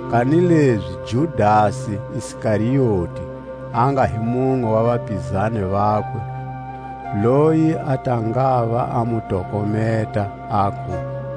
Kanilezi Judasi Iskarioti, a nga hi munwe wa vapizani vakwe, loyi a ta ngava a mu tokometa, aku: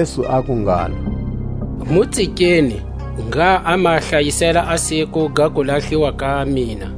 Jesu aku ngalo: Mu tsikeni, ngha a ma hlayisela a siku ga kulahliwa ka mina.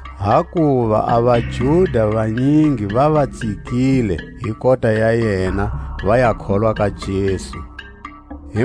hakuva a vaJuda vanyingi va va tsikile hi kota ya yena, va ya kholwa ka Jesu. Jesu a enghena Jerusalema.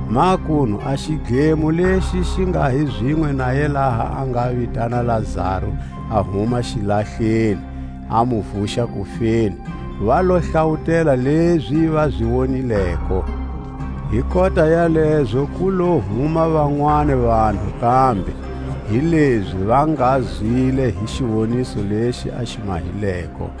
Makunu a xidlemo lexi xi nga hi zinwe naye laha a nga vitana Lazaru a huma xilahleni, a mu vuxa kufeni, va lo hlawutela lezi va zi wonileko. Hi kota ya lezo ku lo huma vanwani vanhu kambe, hilezi va nga zwile hi xiwoniso lexi a xi mahileko.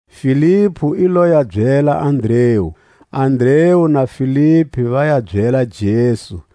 Filipu i lo ya byela Andreu; Andreu na Filipu va ya byela Jesu.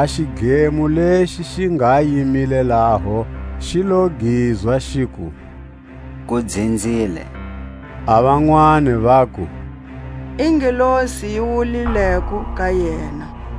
A xidlemo lexi xi nga yimile laho, xi lo gizwa, xiku: Ku dzinzile. A vanwani vaku; I ngelosi yi wulawulileko ka yena.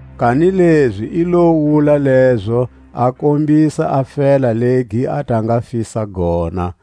Kanilezi i lo wula lezo, a kombisa a fela legi a ta nga fisa gona.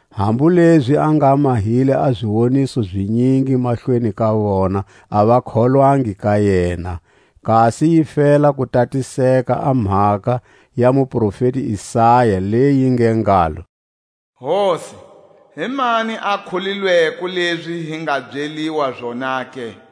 Hambu lezi a nga mahile a ziwoniso zinyingi mahlweni ka vona, a va kholwangi ka yena; kasi yi fela ku tatiseka a mhaka ya muprofeti Isaya, leyi yi nge ngalo: Hosi, himani a kholilweko lezi hi nga byeliwa zona ke?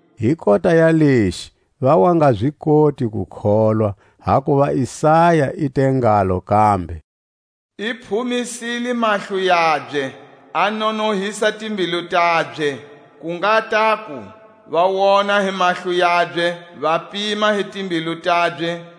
Hi kota ya lexi va wa nga zi koti ku kholwa, hakuva Isaya i te ngalo kambe: I phumisile mahlo yabye, a nonohisa timbilu tabye; Ku nga taku va wona hi mahlo yabye, va pima hi timbilu tabye;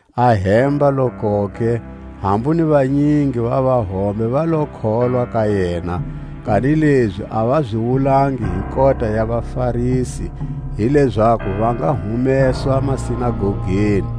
Ahemba-lokoke, hambu ni vanyingi va vahombe va lo kholwa ka yena; kanilezi a va zi wulangi hi kota ya vaFarisi, hi lezaku va nga humeswa sinagogeni;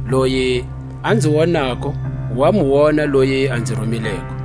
Loyi a nzi wonako, wa mu wona loyi a nzi rumileko.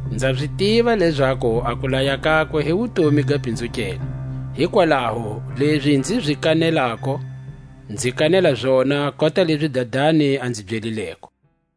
Nza zi tiva lezaku a kulaya kakwe hi wutomi ga pinzukelwa; hikwalaho lezi nzi zi kanelako, nzi kanela zona kota lezi Dadani a nzi byelileko.